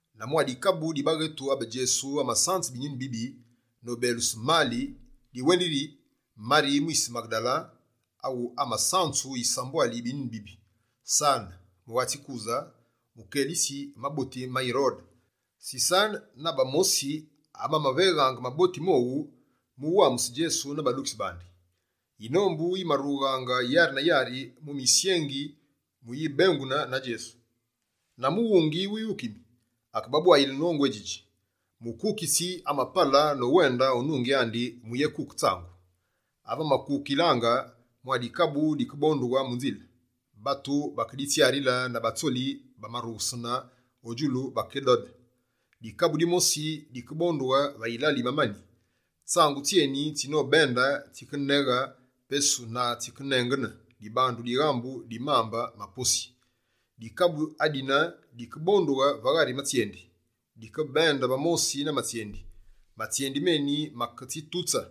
na mwa dikabu di baghetu abe Djesu amasanze binyuni bibi nobeluse mali diwendili yiri: Mari mwise Maghedale awu amasanzu yisambwali yi binyuni bibi, Sane, mughatsi Kuse mukelitsi maboti ma Yirode, Sisane na bamosi abamaveghaange maboti mowu mu uwamuse Djesu na badukitsi bandi. Yinombu yimarughaange yari na yari mu misyengi mu uyibengune na Djesu. Na mughungi wighukimi, akebabwayile nongu édjidji: «Mukukitsi amapale nowende o nungi andi muyékuke tsangu. Ave amakukilaange, mwa dikabu dikebondughe mu nzile. Batu bakeditsyarile na batsoli abamarughusenaange o djulu bakidode. Dikabu dimosi, dikebondughe va yilale yi mamani. Tsangu tsyeni, tsinobende, tsikeneghe pesu na tsikenengene dibandu dighambu di posi mambe. Dikabu adine, dikebondughe va ghari matsyendi. Dikebende va mosi na matsyendi. Matsyendi meni maketsitutse.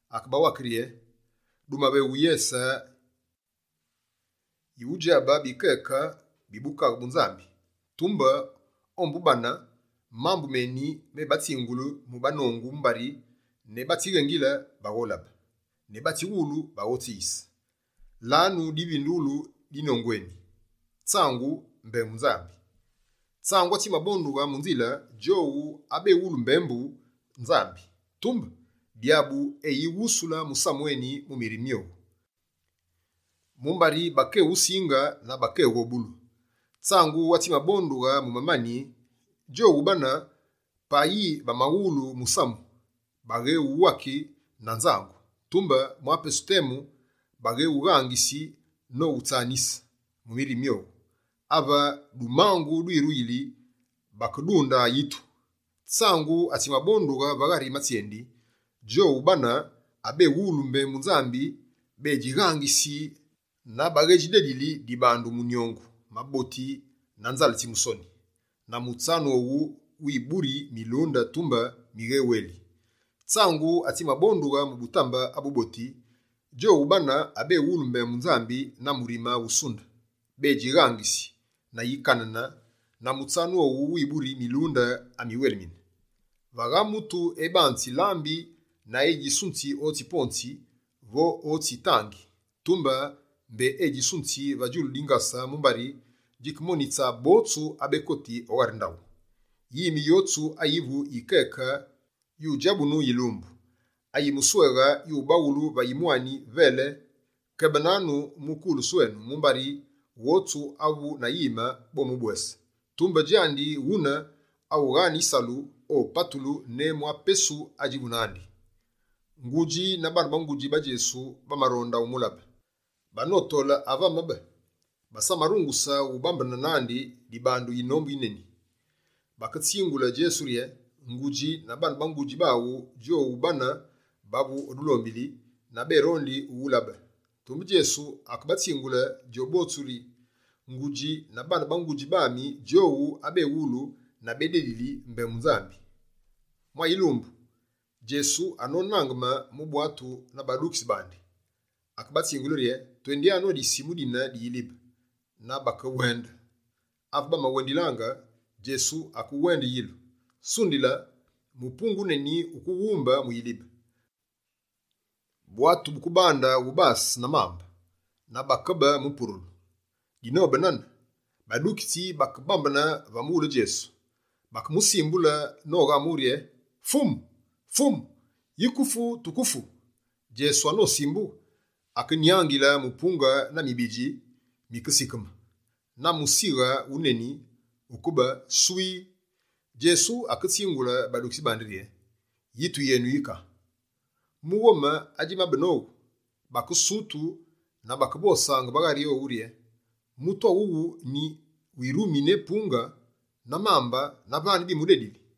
Akebawake rye: «Dumaveghu yese yudjabe bikeke bi Bukaghe bu Nzambi, tumbe ombu bane, mambu meni, me batsingulu mu banongu mumbari: “Ne batsighengile, bagholabe; ne batsiwulu, baghotsiyise.”» «Lanu divindughulu di nongu eni: tsangu, mbembu Nzambi. Tsangu atsimabondughe mu nzile, djowu abewulu mbembu Nzambi. Tumbe Dyabu eyiwusule musamu eni mu mirime myowu, mumbari bakewusinge na bakeghobulu. Tsangu atsimabondughe mu mamani, djowu bane, payi bamawulu musamu, bakewuwake na nzangu. Tumbe mwa pesu temu, baghewughangisi nowutsanise mu mirime myowu. Ave dumangu dwiruyili, bakedunde yitu. Tsangu atsimabondughe va ghari matsyendi, djowu bane, abewulu mbembu Nzambi bedjighangisi na baghedjidedili dibandu munyongu, maboti na nzale tsi musoni. Na mutsanu owu wiburi milunde, tumbe migheweeli. Tsangu atsimabondughe mu butambe abu boti, djowu bane abewulu mbembu Nzambi na murime wusunde, bédjighangisi na yikanane na mutsanu owu wiburi milunde amiweeli.» «Vagha mutu ebanzi lambi na edjisunzi otsi ponzi vo otsi tangi, tumbe mbé odjisunze va djulu dingase mumbari djikemonitse botsu abekoti o ghari ndaghu. Yime yotsu ayivu yikeke yudjabunu yilumbu; ayimusweghe, yubawulu va yimwani “velee”. Kebenanu mu kulusu enu, mumbari, wotsu avu na yime, bomubwese. Tumbe, djandi wune awu aghaane yisalu, opatulu ne mwa pesu adjivu nandi.» Ngudji na baane ba ngudji ba Djesu, bamaronde umulabe. Banotole ave amabe, basamarunguse ubambene nandi dibandu yinombu yeni. Baketsingule Djesu rye: «Ngudji na baane ba ngudji aghu djowu bane bavu o dulombili na bérondi uwulabe.» Tumbe Djesu akebatsingule djobotsu rye: «Ngudji na baane ba ngudji ami, djowu abewulu na bédedili mbembu Nzambi.» Mwa yilumbu, Djesu anonangeme mu bwatu na badukitsi bandi, akebatsingule rye: «Twendyanu o disimu dine di yilibe.» Na bakewende. Ave bamawendilaange, Djesu akewende yilu. Sundile mupunge wuneni wukeghumbe mu yilibe, bwatu bukebande wubase na mambe, na bakabe mu purulu. Dinobe nane, badukitsi bakebambene va mughule Djesu, bakemusimbule noghamughe rye: «Fumu, Fumu, yike ufu, tukefu!» Djesu anosimbughe, akenyangile mupunge na mibidji, bikesigheme. Na musighe wuneni wukabe «swii». Djesu aketsingule badukitsi bandi rye: «Yitu yenu yika?» Mu ghome adjimabe nowu, bakesutu na bakevosaange va ghari owu rye: «Mutu awuwu nyi wirumi ne mupunge na mambe na vane bimudedili!»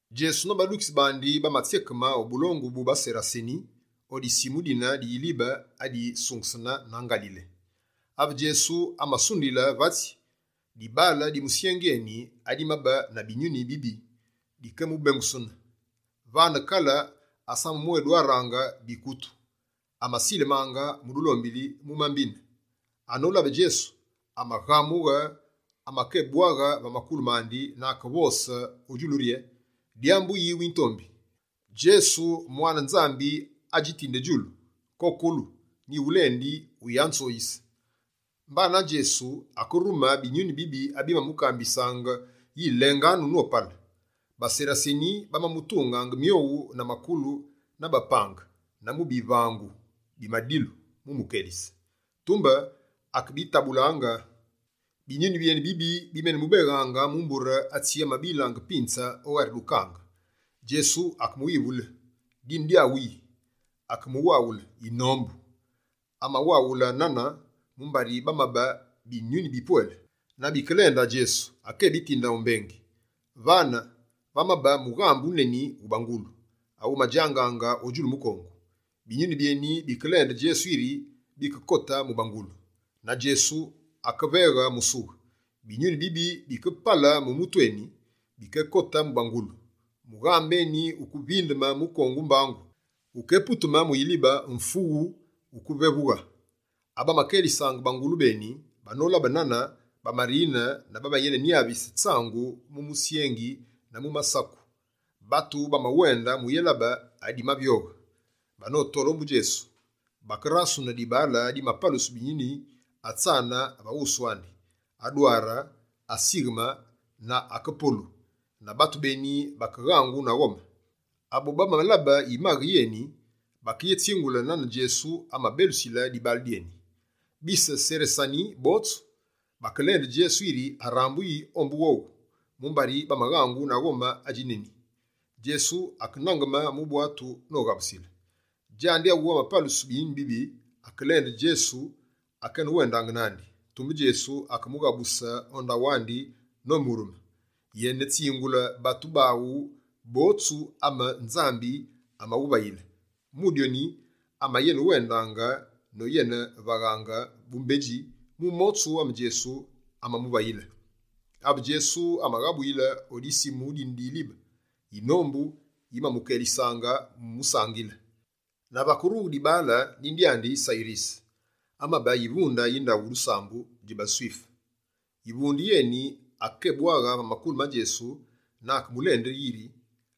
Djesu na badukitsi bandi bamatsyekeme o bulongu bu baSeraseni o disimu dine di yilibe adisungesene na Ngalile. Ave Djesu amasunduyile vatsi, dibaale di musyengi eni, adimabe na binyuni bibi dikeyémubengusene. Vane kale asamamwédwaraange bikutu, amasileminaange mu dulombili, mu mambine. Anolabe Djesu, amaghamughe, amakebwaghe va makulu mandi na akevose o djulu rye: «Dyambu yi witombi, Djesu, Mwane Nzambi adjitinde djulu? Kokolu, nyighulendi, wuyanzoyise!» Mbana Djesu akerume binyuni bibive abimamukambisaange yi lenganu nopale. BaSeraseni, bamamutungaange myowu na makulu na bapange na mu bivangu bi madilu mu umukelise. Tumbe, akebitabulaange. Binyuni byeni bibi bimenemubeghaange mu mbure atsi amabilaange pinze o ghari dukange. Djesu akemuwivule: «Dine dyaghu yi?» Akemuwaghule: «Yinombu». Amawaghule nane, mumbari bamabe binyuni bipwele. Na bikelende Djesu, akébitinde o Mbengi. Vane, vamabe mughambe wuneni wu bangulu awumadjangaange o djulu mukongu. Binyuni byeni bikelende Djesu yiri bikekote mu bangulu. Na Djesu akebaveghe musughe. Binyuni bibi bikepale mu mutu eni, bikekote mu bangulu. Mughambe eni wukevindeme mukongu mbangu, wukeputume mu yilibe «mfughuu», wukevevughe. Abamakelisaange bangulu beni, banolabe nane, bamarine na bamenenyavise tsangu mu musyengi na mu masaku. Batu bamawende muyélabe adimavyoghe. Banotole ombu Djesu, bakerasune dibaale adimapalusu binyuni atsane va wusu andi, adware, asigheme na akepolu. Na batu beni bakeghangu na ghome. Abobamalabe yimaghe yeni, bakeyetsingule nane Djesu amabelusile dibaale dyeni. Bise Seraseni botsu, bakelende Djesu yiri arambuyi ombu wowu, mumbari bamaghangu na ghome adji neni. Djesu akenangeme mu bwatu noghabusile. Djandi awu amapalusu binyuni bibi, akelende Djesu akenewendaange nandi. Tumbe Djesu akemughabuse o ndaghu andi nomurume: «Yenetsingule batu baghu botsu ame Nzambi amawuvayile.» Mu dyoni, amayenewende noyenevaghaange bumbedji mu motsu ame Djesu amamuvayile. Ave Djesu amaghabuyile o disimu dine di yilibe, yinombu yimamukelisaange mu umusangile. Na vakerughe dibaale, dine dyandi Sayirise amabe yivunde yi ndaghu dusambu dji baSwife. Yivunde yeni akekebwaghe va makulu ma Djesu na akemulende yiri: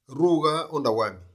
«Rughe o ndaghu ami.»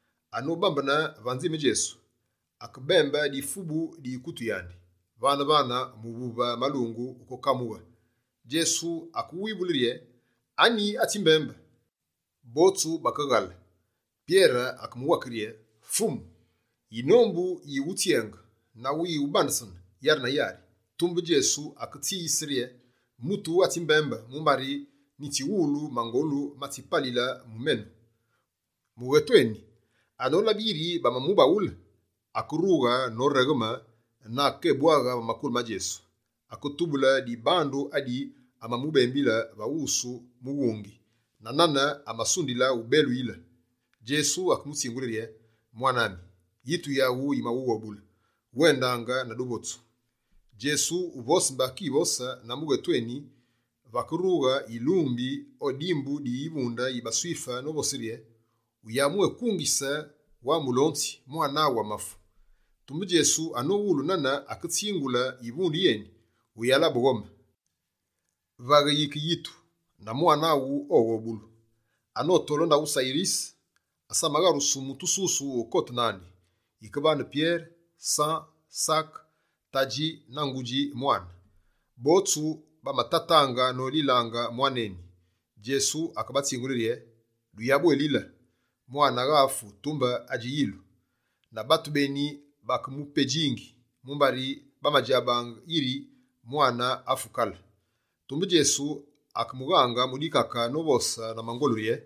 Anobambene va nzime Djesu, akebembe difubu di yikutu yandi. Vane-vane, muvuve malungu ukekamughe. Djesu akewivule rye: «Anyi atsimbembe?» Botsu bakeghale. Pyere akemuwake rye: «Fumu, yinombu yiwutsyenge, na yiwubandesene yari na yari.» Tumbe Djesu aketsiyise rye: «Mutu atsimbembe mumbari nyitsiwulu mangolu matsimapale mu menu.» Mughetu eni, anolabe yiri bamamubaghule, akerughe noregheme na akekebwaghe va makulu ma Djesu, aketubule dibandu adi amamubembile va wusu mughungi, na nane amasunde ubeluyile. Djesu akemutsingule rye: «Mwane ami, yitu yaghu yimaghughobule, wendangaange na duvotsu.» Djesu uvose mbé akivose na mughetu eni, vakerughe yilumbi o dimbu di yivunde yi baSwife novose rye: «Wuyabwékungise wa Mulonzi, mwane amafu.» Tumbe Djesu anowulu nane, aketsingule yivunde yeni: «Wuyalabe ghome, vaghe yike yitu, na mwane aghu oghobulu.» Anotole o ndaghu Sayirise, asamagharusu mutu ususu ukote nandi, yike vane Pyere, San, Sake, tadji na ngudji mwane. Botsu bamatataange nolilaange mwane eni. Djesu akebatsingule rye: «Duyabwelile, mwane agha afu, tumbe adji yilu.» Na batu beni bakemupedjingi, mumbari bamadjabaange yiri mwane afu kale. Tumbe Djesu akemughaange mu dikake novose na mangolu rye: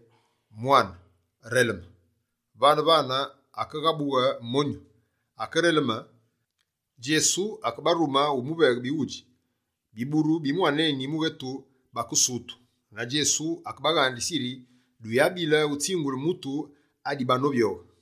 «Mwane, releme!» Vane-vane, akeghabughe monyu, akereleme. Djesu akebarume umuveghe bighudji. Biburu bi mwane eni mughetu bakesutu, na Djesu akebaghandise yiri duyabile utsingule mutu adibanovyoghe.